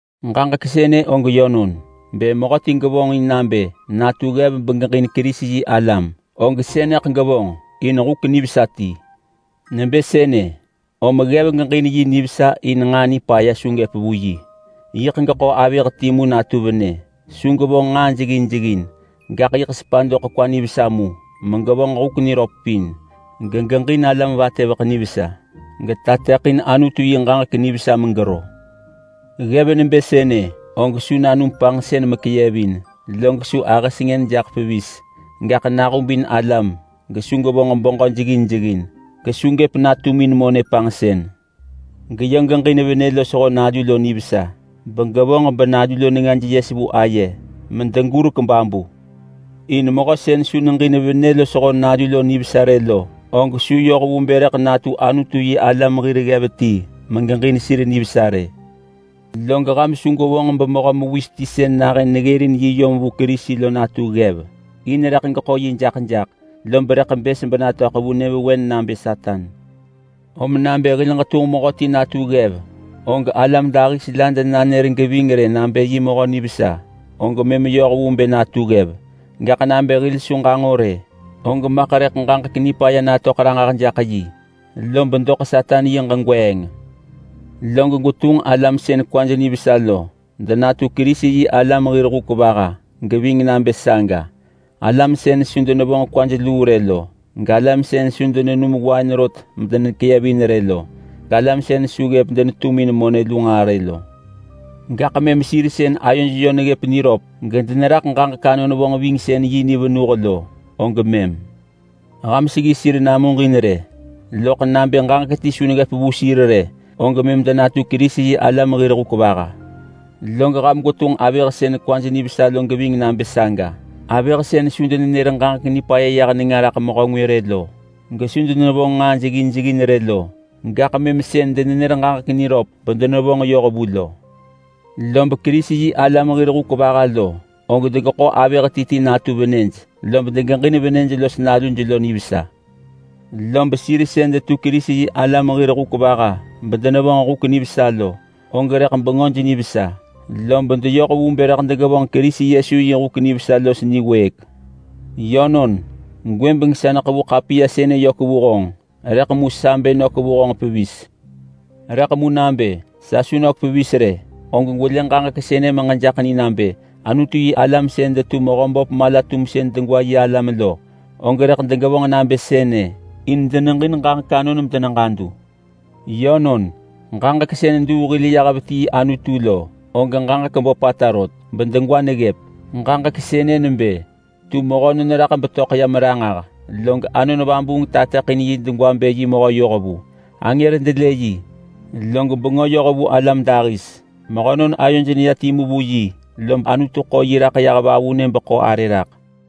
Ġaġek sënë og yönon: Bë mehöti gevonġin nabë natu ggev begeġin Kerisi-yi-alam, og sënëḳ gevonġ in huk nivesa ti. Nebë sënë, om ggev geġin yi nivesa in nġaa nipaya su gëp vu yi. Yiḳ geḳo avëh timu natu venë. Su gevonġ nġaa jeggin jeggin, gaḳ yiḳ sepa doḳ kwa nivesa mu megevonġ huk niröp pin, gegeġin alam vatëveḳ nivesa, getateḳin Anutu yi ġaġek nivesa megero. Ggev nebë sënë og su nanum panġsën mekeyevin, log su ahë sengën jaḳ pevis, gaḳ nahubin alam gesu gevonġ beġö jeggin jeggin, gesu gëp natumin monë panġsën. Geyö geġin venë lo nalu lo nivesa begevonġ benalu lo nengaj yes vu aye medegurek babu. In mehö sën su neġin venë lo nalu lo nivesa rë lo, og su yoh vu bë rëḳ natu Anutu-yi-alam lo hir ggev megeġin sir nivesa rë. Log ham su gwevonġ bemehö mewis ti sën nahën neggërin yi yom vu Kerisi lo natu ggev. In rëḳ geḳo yi jaḳ jaḳ lob rëḳ bës benatöḳ vu nyëvewen nabë Satan. Om nabë hil ġetunġ mehöti natu ggev, og alam dahis la denanër geving rë nabë yi mehö nivesa, og mëm yoh vu bë natu ggev. Gaḳ nabë hil su ġanġo rë, og maḳ rëḳ ġaġek nipaya natöḳ ranġah jaḳ yi, lob doḳ Satan yi ġegweeng. Log gwetunġ alam sën kwaj nivesa lo denatu Kerisi-yi-alam hir hur geving nabë saga. Alam sën su denevonġ kwaj luu rë lo, galam sën su denenum wain rot medenekeyevin rë lo, galam sën su ggëp denetumin monë luu nġaa rë lo. Gaḳ mëm sir sën ayoj yö neggëp niröp gedeneraḳ ġaġek-anon-vonġvingsën-yi ni venuh lo og mëm. Ham seggi sir namuġin rë, loḳ nabë ġaġek ti su neggëp vu sir rë, og mëm denatu Kerisi-yi-alam hir hur. Log ham gwetunġ avëh sën kwaj nivesa lo geving nabë saga. Avëh sën su denenër ġaġek nipaya yah nenga raḳ mehö ngwë rë lo, gesu denevonġ nġaa jeggin jeggin rë lo, gaḳ denenër ġaġek niröp bedenevonġ yoh vu lo. Lob Kerisi-yi-alam hir hur lo, og degeḳo avëh ti ti natu venëj, lob degeġin venëj los naluj nivesa. Lob sir sën detu Kerisi-yi-alam hir hur bedenevonġ huk nivesa lo, og rëḳ bengöj nivesa, lob deyoh vu bë rëḳ degevonġ Kerisi Yesu yi huk nivesa los niwëëk. Yönon, gwëbeng sa neḳevu ḳapiya sënë yök vu honġ, rëḳ mu sa bë nök vu honġ pevis. Rëḳ mu nabë sa su nök pevis rë, og gwelë ġaġek sënë megejaḳ ni nabë Anutu-yi-alam sën detu Mehöböp Mala-tumsën-degwa yi alam lo, og rëḳ degevonġ nabë sënë in deneġin ġaġek anon medeneġadu. Yönon, ġaġek sën duu hil yah vetii Anutu lo, og ġaġek böpata rot bedegwa neggëp. Ġaġek sënë nebë: Tu mehönon raḳ betöḳ yam ranġah, log Anon Vabuung tateḳin yi degwa bë yi mehö yohvu. Angër delë yi, log bengö yoh vu alam dahis. Mehönon ayoj neya timu vu yi, lob Anutu ḳo yi raḳ yah vavunë beḳo arë raḳ.